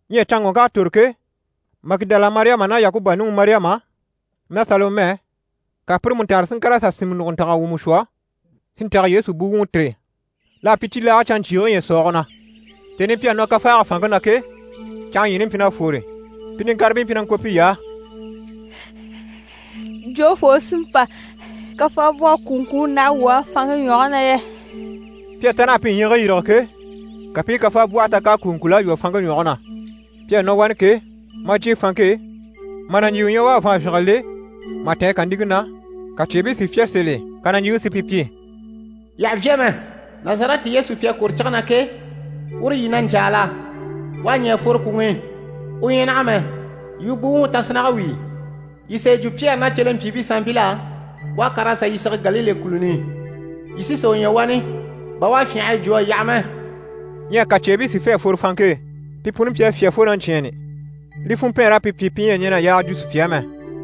Ɲyɛ canŋɔŋk'à tòro ke, Magidala Mariyama ná Yakuba nuŋi Mariyama ná Salomɛ, ka pire mú taanre si ŋkàr'a sà sìnmɛ nùguntanga wumɔ shwɔ si ntɛ̀gɛ Yesu buwuŋi tìri. L'à pyi cibilaage canɲcyiige ɲyɛ̀sɔɔge na. Tèni i pi à nɔ kafaage fanŋke na ke, canŋa ɲyiini mpyi na fwore. Pi niŋkaribii mpyi na ŋko piy'á: «Jofoo u sí n‑pa kafaabwɔhe kùuŋkuu n‑láha wuu á fanŋke ɲwɔge na yɛ?» Pi à ta naha pi ɲyiigii yîrige ke, ka pi i kafaabwɔhe ta k'à kùuŋkul'a lwɔ́ fanŋke ɲwɔge na. Pi à nɔ wani ke, maa jyè fanŋke e, mà nàɲjiiwe ɲya u à vàanvyinge le, mà tɛ̀ɛn kàniŋke na, ka cyeebii si fyá sèl'e. Ka nàɲjiiŋi si pi pyi: «Yii àha vyá mɛ. Nazarɛti Yesu pi à kwòro cige na ke, uru yii na ɲcaa la? U à ɲɛ̀ a fworo kwùŋi i, u ɲyɛ naha mɛ. Yii u buwuŋi tasinnage wíi. Yii sà yi jwo Pyɛri ná cyelempyiibii sanmpil'á “U à kàr'a sà yii sige Galile kùluni i. Yii sí sà u ɲya wani, bà u à fyânha a yi jwo a yaha mɛ.”» Ɲyɛ ka cyeebii si fê a fworo fanŋke e. Pi puni mpyi a fyá fo na ɲcyɛ̂ɛnni. Li funmpɛɛnr'à pi pyi pi ɲyɛ a ɲɛn'a yaaga jwo sùpya á mɛ. [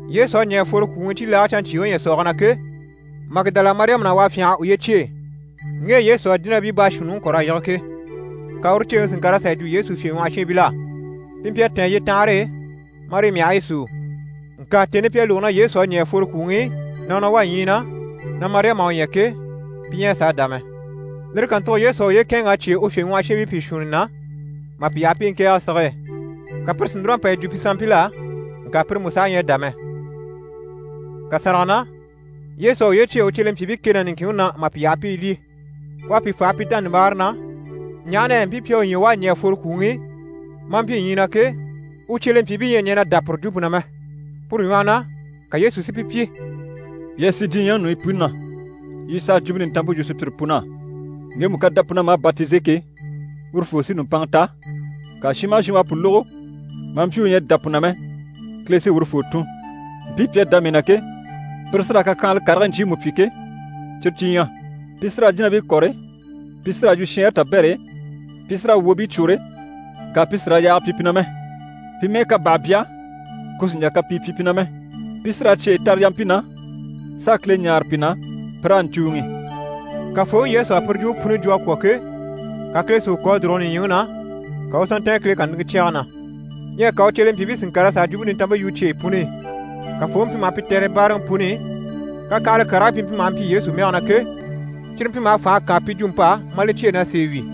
Yesu à ɲɛ̀ a fworo kwùŋi i cibilaage canɲcyiige ɲyɛ̀sɔɔge na ke, Magidala Mariyama na u à fyânha a uye cyêe, ŋge e Yesu à jínabii baashuunniŋi kɔ̀r'a yige ke. Ka uru ceeŋi si ŋkàr'a sà yi jwo Yesu fyèɲwɔhɔshiinbil'á. Pi mpyi a tɛ̀ɛn yyetanhare e, marii myahigii súu. Ŋka tèni i pi a lógo na Yesu à ɲɛ̀ a fworo kwùŋi i, na u wá ɲyii na, na Mariyama à u ɲya ke, pi ɲyɛ a sàa dá mɛ. Lire kàntugo Yesu à uye kɛ̂ɛnŋ'a cyêe u fyèɲwɔhɔshiinbii pìi shuunni na mà pi yaha pi i ŋkɛ̀ɛge sige e. Ka pire si núr'a pa yi jwo pi sanmpil'á, ŋka pire mú saha ɲyɛ a dá mɛ. Kàsanrage na, Yesu à uye cyêe u cyelempyiibii kɛ ná niŋkinŋi na mà pi yaha pi i lyî. U à pi faha pi dánabaare na, ɲaha na yɛ mpii pi à u ɲya u à ɲɛ̀ a fworo kwùŋi i, maa mpyi ɲyii na ke, u cyelempyiibii ɲyɛ a ɲɛn'a dá pire jwumpe na mɛ. Puru ɲwɔhɔ na, ka Yesu si pi pyi: «Yii a sì diɲyɛŋi ɲùɲyi puni na, yii s'a Jwumpe Nintanmpe yu sùpyire pun'á. Ŋgemu ká dá pu na, maa batize ke, urufoo sí nùmpanŋa ta, ŋka shin maha shin u à pu lógo, maa mpyi u ɲyɛ a dá pu na mɛ, Kile sí urufoo tùn. Mpii pi à dá mii na ke, pire sí raa kakyanhala karigii ɲcyiimu pyi ke, cyire cyi ɲyɛ: pi sí raa jínabii kɔ̀re, pi sí raa yu shɛɛnre tabɛr'e, pi sí raa wwòobii cwôre, ŋka pi sì raa yaage pyi pi na mɛ. Pi mɛ́ɛ ká bàha bya, ku sì n‑jà kapii pyi pi na mɛ. Pi sí raa cyeyi tare yampii na, s'a Kile ɲáare pi na pi raa ɲcùuŋi.» Kafooŋi Yesu à puru jwumpe puni jwo a kwɔ̀ ke, ka Kile si u kò a dùrugo nìɲyiŋi na, ka u u sà ntɛ̀ɛn Kile kàniŋɛ cyɛge na. Ɲyɛ ka u cyelempyiibii si ŋkàr'a sà a Jwumpe Nintanmpe yu cyeyi puni i. Kafooŋi mpyi maha pi tɛ̀re báaraŋi puni i, kakyanhala karigii pi mpyi maha mpyi Yesu mɛge na ke, cyire mpyi maha fànha kaan pi jwump'á, mà li cyêe na sèe wi.]